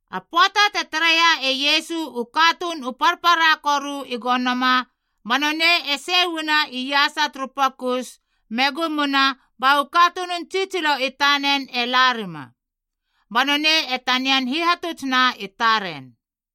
A pöata te tareia e Iesu u katuun u parpara koru i gonoma, ba nonei e sei uana iasa turu pokus, me gumuna ba u katunun tsitsilo i tanen e larima, ba nonei e tanian hihatutsna i taren.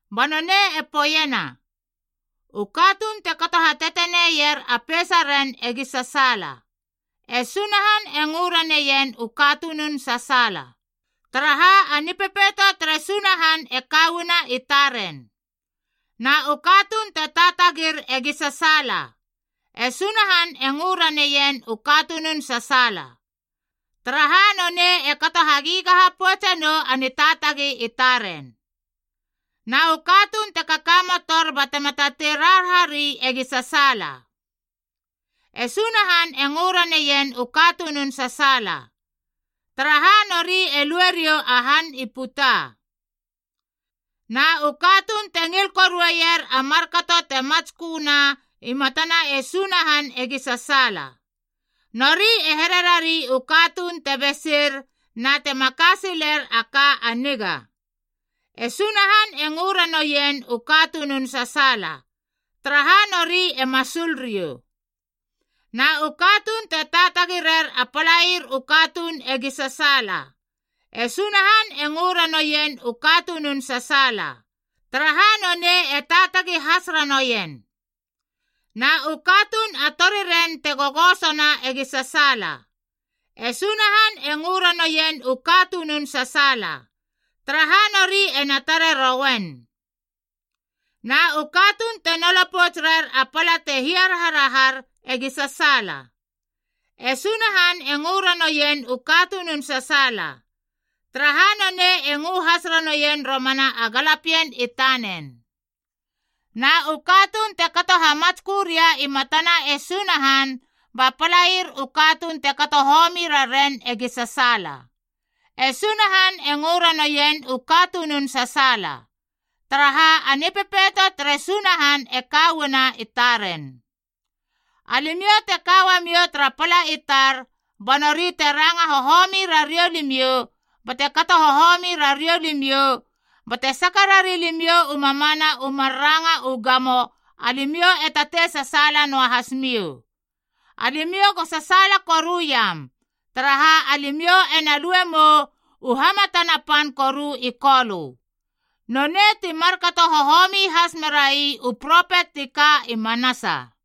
Ba nonei e poeiena, “U katuun te kato hateteneier a peisaren egi sasaala. E Sunahan e ngö raneien u katunun sasaala, taraha a Nipepeito tere Sunahan e ka uana i taren. Na u katuun te taatagir egi sasaala. E Sunahan e ngö raneien u katunun sasaala, taraha nonei e kato hagigaha poutse nou a nitaatagi i taren. Na u katuun te kakamotor batema tatei raharahari egi sasaala. E Sunahan e ngö raneien u katunun sasaala, taraha nori e lue riou a han i puta. Na u katuun te ngil korueier a markato te matsköna i matana e Sunahan egi sasaala. Nori e here rari u katuun te besir na te maka siler a ka a niga. E Sunahan e ngö ranoien u katunun sasaala, taraha nori e masul riou. Na u katuun te taatagi rer a palair u katuun egi sasaala. E Sunahan e ngö ranoien u katunun sasaala, taraha nonei e taatagi has ranoien. Na u katuun a toriren te gogosona egi sasaala. E Sunahan e ngö ranoien u katunun sasaala, taraha nori ena tare roien. Na u katuun te nolo pouts rer a pala te hiaraharahar egi sasaala. E Sunahan e ngö ranoien u katunun sasaala, taraha nonei e ngö has ranoien romana a galapien i tanen. Na u katuun te kato hamatskö ria i matana e Sunahan ba palair u katuun te kato homi raren egi sasaala. E Sunahan e ngö ranoien u katunun sasaala, taraha a Nipepeito tere Sunahan e ka uana i taren. “Alimiou te ka uamiou tara pala i tar, ba nori te ranga hohomi rariou limiou, bate kato hohomi rariou limiou, bate saka rari limiou u mamana u mar ranga u gamo, alimiou e tatei sasaala noahas miou. Alimiou go sasaala koruiam, taraha alimiou ena lue mou u hamatana pan koru i Kolö. Nonei ti markato hohomi has merai u propet ti ka i manasa.”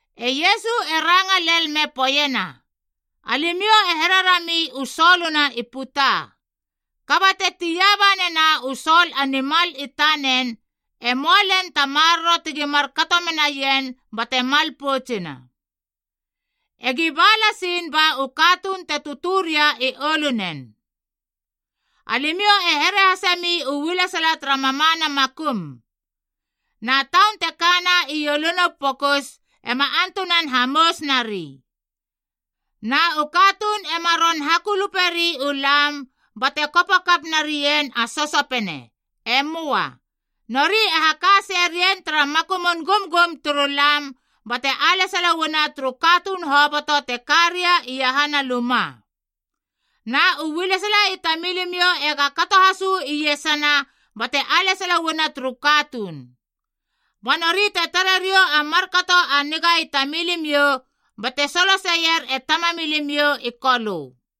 E Iesu e ranga lel me poeiena, “Alimiou e here rami u soluna i puta. Kaba te tia banena u sol a nimal i tanen, e möa len ta maroro tegi markato menaien bate mal poutsina.a E gi ba lasiin ba u katuun te tötö ria i oulunen. “Alimiou e here hasemi u ualesala tara mamana makum. Na taun te kana i ouluna u pokus ema antunan hamous nari. Na u katuun ema ron hakuluperi u lam bate kopo kap narien a sosopene. E möa. Nori e haka seie rien tara makumun gumgum turu lam bate alesala uana turu katuun hoboto te ka ria iahana luma. Na u ualesala i tamilimiou ega kato has uu iesana bate alesala uana turu katuun. Ba nori te tare riou a markato a niga i tamilimiou bate soloseier e Tamamilimiou i Kolö.”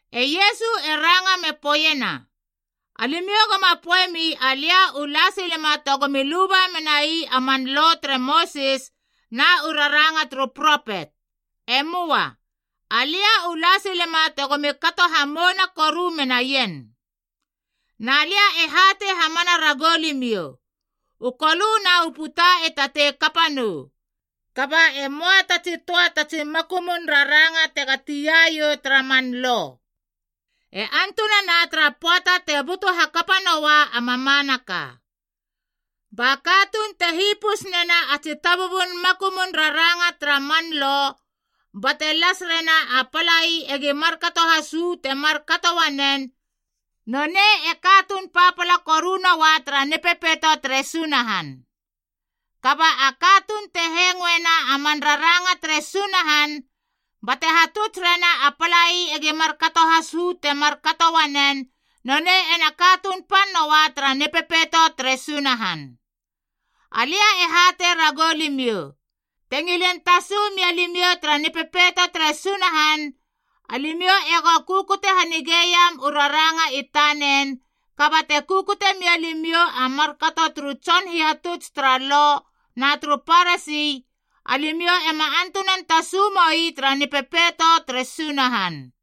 E Iesu e ranga me poeiena, “Alimiou goma poeiemi alia u la silema tegomi luba menai a man Lo tere Mosis na u raranga turu propet. E möa. Alia u la silema tegomi kato hamouna koru menaien. Na lia e hatei hamana ragou limiou, u kolö na u puta e tatei kapa nou, kaba e möa ta tsi töa ta tsi makumun raranga tega tia iou tara man Lo, e antunana tara pöata te butu hakapa noa a mamanaka. Ba katuun te hipus nena a tsi tabubun makumun raranga tara man Lo bate las rena a palai egi markato has uu te markato uanen, nonei e katuun papala koru noa tara Nipepeito tere Sunahan. Kaba a katuun te hengoena a man raranga tere Sunahan, bate hatuts rena a palai egi markato has uu te markato uanen, nonei ena katuun pan noa tara Nipepeito tere Sunahan. Alia e hatei ragou limiou, te ngilin tasu mia limiou tara Nipepeito tere Sunahan, alimiou ego kukute hanigeiam u raranga i tanen, kaba te kukute mia limiou a markato turu tson hihatuts tara Lo na turu Parasi, alimiou ema antunan tasu moi tara Nipepeito tere Sunahan.”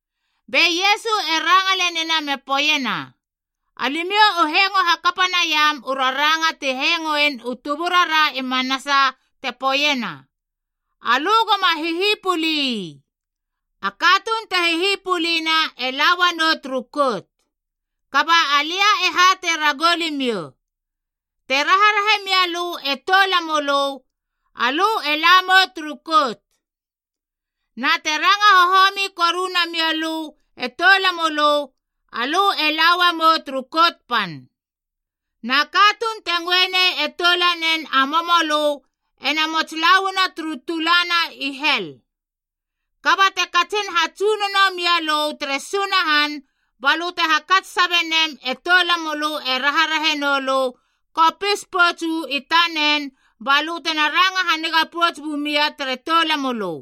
Be Iesu e ranga lenina me poeiena, “Alimiou u hengo hakapa naiam u raranga ti hengoen u tuburara i manasa te poeiena, ‘Alö goma hihipuli ii. A katuun te hihipulina e la uanou turu kout.’ Kaba alia e hatei ragou limiou, te raharahe mia lö e toulamölö, alö e la mou turu kout. Na te ranga hohomi koru namia lö e toulamölö, alö e la uamou turu kout pan. Na katuun te ngöe nei e toulanen a momolö ena mots lauana turu tulana i hel. Kaba te katsin hatsunono mialö tere Sunahan balö te hakats sabe nem e toulamölö e raharahe noulö, kopis pouts uu i tanen balö tena ranga haniga pouts bumia tere toulamölö.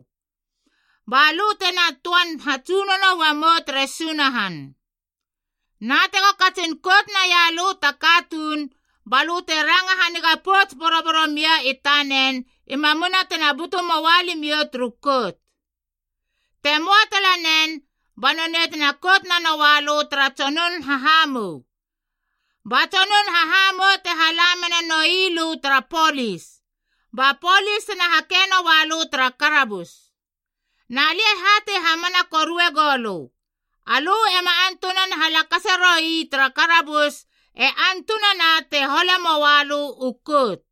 Ba lö tena töan hatsunono uamou tere Sunahan. “Na tego katsin kout naia lö ta katuun, balö te ranga haniga pouts boroboro mia i tanen i mamuna tena butu möa limiou turu kout. Te moa talanen, ba nonei te kout nanoa lö tara tsonun hahamou, ba tsonun hahamou te hala menanoi lö tara polis, ba polis tena hake noa lö tara karabus. Na lia e hatei hamana korue goulö, alö ema antunan halakase roi tara karabus e antunana te hole moa lö u kout.”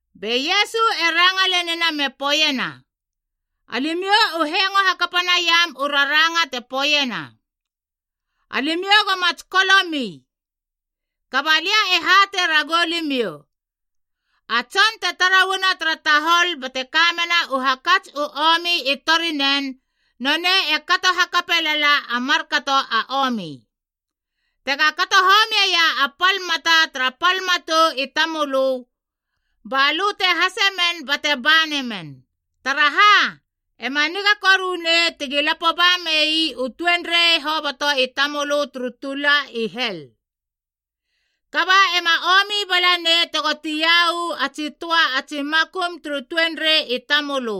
Be Iesu e ranga lenina me poeiena, “Alimiou u hengo hakapa naiam u raranga te poeiena, ‘Alimiou goma tsikolomi.’ Kaba alia e hatei ragou limiou, a tson te tara uana tara tahol bate ka mena u hakats u omi i torinen, nonei e kato hakape lala a markato a omi. Tega kato homieia a pal mata tara pal matou i tamölö, balö te hasemen bate ba namen! Taraha, ema niga korunei tegi lapo ba mei u tuenrei hoboto i tamölö turu tula i hel, kaba ema omi bala nei tego tia uu a tsi töa a tsi makum turu tuenrei i tamölö.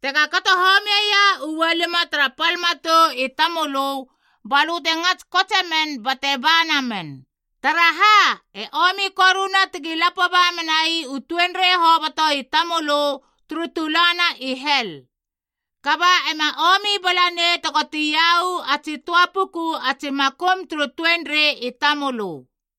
Tega kato homieia ualima tara pal matou i tamölö, balö te ngats kotsemen bate ba namen! Taraha, e omi koruna tegi lapo ba menai u tuenrei hoboto i tamölö turu tulana i hel, kaba ema omi bala nei tego tia uu a tsi töa puku a tsi makum turu tuenrei i tamölö.”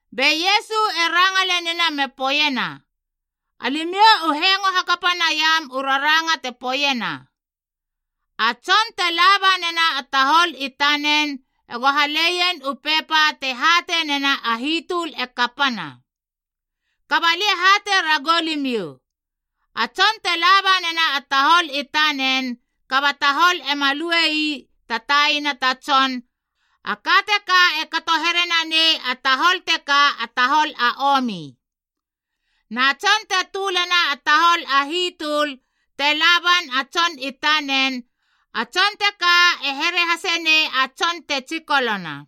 Be Iesu e ranga lenina me poeiena, “Alimiou u hengo hakapa naiam u raranga te poeiena, ‘A tson te laba nena a tahol i tanen ego haleien u pepa te hatei nena a hitöl e kapana.’ Kaba alia e hatei ragou limiou, a tson te laba nena a tahol i tanen kaba tahol ema lue ii ta taina ta tson, a ka teka e kato here nanei a tahol teka a tahol a omi. Na tson te tölena a tahol a hitöl te laban a tson i tanen, a tson teka e here hase nei a tson te tsikolona.”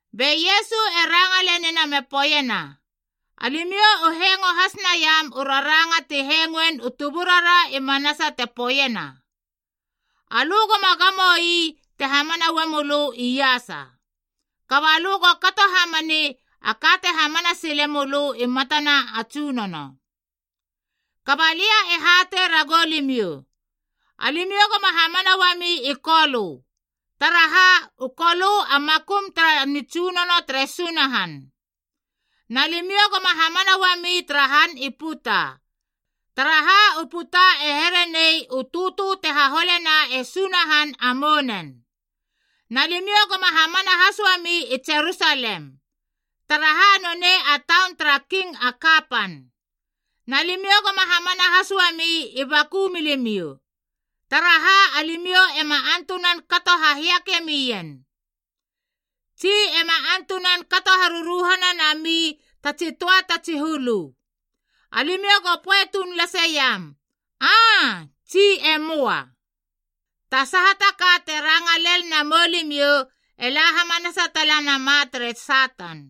Be Iesu e ranga lenina me poeiena, “Alimiou u hengo has naiam u raranga ti hengoen u tuburara i manasa te poeiena, ‘Alö goma gamo ii te hamana uamölö iasa, kaba lö go kato hamani a ka te hamana sile mölö i matana a Tsunono.’ Kaba lia e hatei ragou limiou, alimiou goma hamana uami i Kolö, taraha u Kolö a makum tara nitsunono tere Sunahan. Na limiou goma hamana uami tara han i puta, taraha u puta e here nei u tötö te haholena e Sunahan a mounen. Na limiou goma hamana has uami i Jerusalem, taraha nonei a taun tara King a kapan. Na limiou goma hamana has uami i baku milimiou, taraha alimiou ema antunan kato hahiake mien, tsi ema antunan kato haruruhana nami ta tsi töa ta tsi hulu. Alimiou go poe tuun laseiam, ‘Aa’ tsi ‘E möa.’ Ta saha ta ka te ranga lel namou limiou e la hamanasa tala nama tere Satan.”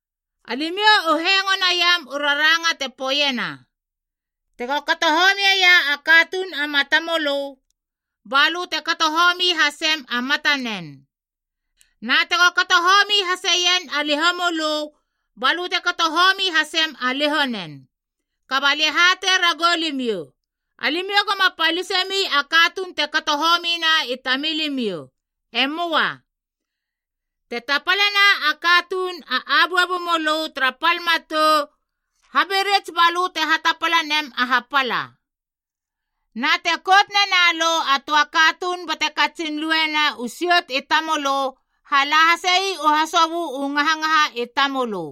“Alimiou u hengo naiam u raranga te poeiena, ‘Tego kato homiea a katuun a matamölö, balö te kato homi hasem a matanen, na tego kato homi haseien a lihomölö balö te kato homi hasem a lihonen.’ Kaba alia e hatei ragou limiou, alimiou goma palisemi a katuun te kato homina i tamilimiou. E möa. Te tapalena a katuun a abuabu mölö tara pal matou, habirits balö te hatapala nem a hapala. Na te kout nena lö a töa katuun bate katsin luena u siot i tamölö, hala hasei u hasobö u ngahangaha i tamölö.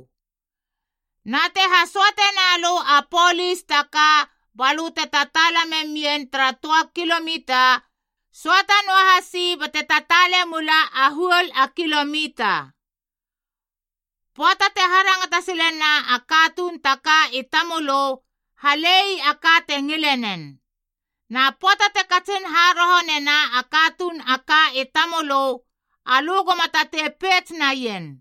Na te hasöate na lö a polis ta ka balö te tataala memien a töa kilomita, söata noahasi bate tataale mula a huol a kilomita. Pöata te harangata silena a katuun ta ka i tamölö, halei a ka te ngile nen. Na pöata te katsin haroho nena a katuun a ka i tamölö, alö goma tatei peits naien.”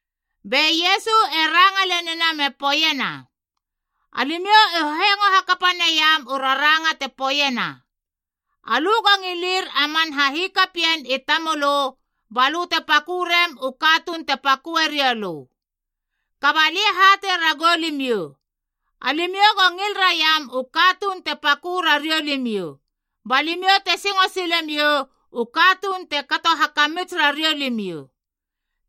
Be Iesu e ranga lenina me poeiena, “Alimiou u hengo hakapa naiam u raranga te poeiena, ‘Alö go ngilir a man hahikapien i tamölö balö te pakö rem u katuun te paköe riou lö.’ Kaba alia e hatei ragou limiou, alimiou go ngil raiam u katuun te pakö rariou limiou, ba limiou te singo sile miou u katuun te kato hakamits rariou limiou.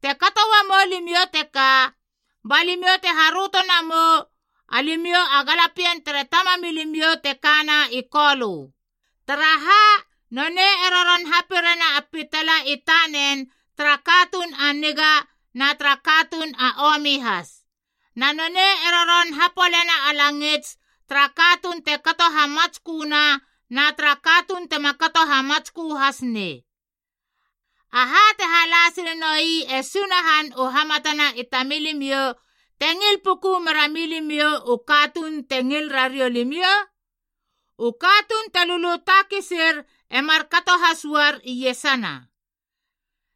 Te kato uamou limiou teka, ba limiou te haröto namou alimiou a galapien tere Tamamilimiou te kana i Kolö. Taraha, nonei e roron hapirena a pitala i tanen tara katuun a niga na tara katuun a omi has, na nonei e roron hapolena a langits tara katuun te kato hamatsköna na tara katuun tema kato hamatskö has nei. Aha te hala sile noi e Sunahan u hamatana i tamilimiou, te ngil puku merami limiou u katuun te ngil rariou limiou? U katuun te lulu takisir e markato has uar iesana.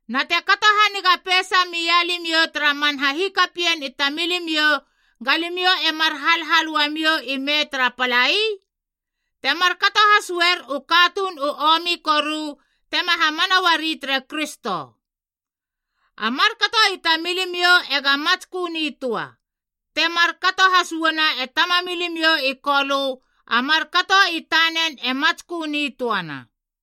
Na te kato haniga peisa mia limiou tara man hahikapien i tamilimiou, ga limiou e mar halhal uamiou ime tara palai? Te markato has uer u katuun u omi koru tema hamana uari tere Kristo. A markato i tamilimiou ega matskö nitöa, te markato has uana e Tamamilimiou i Kolö a markato i tanen e matskö nitöana.”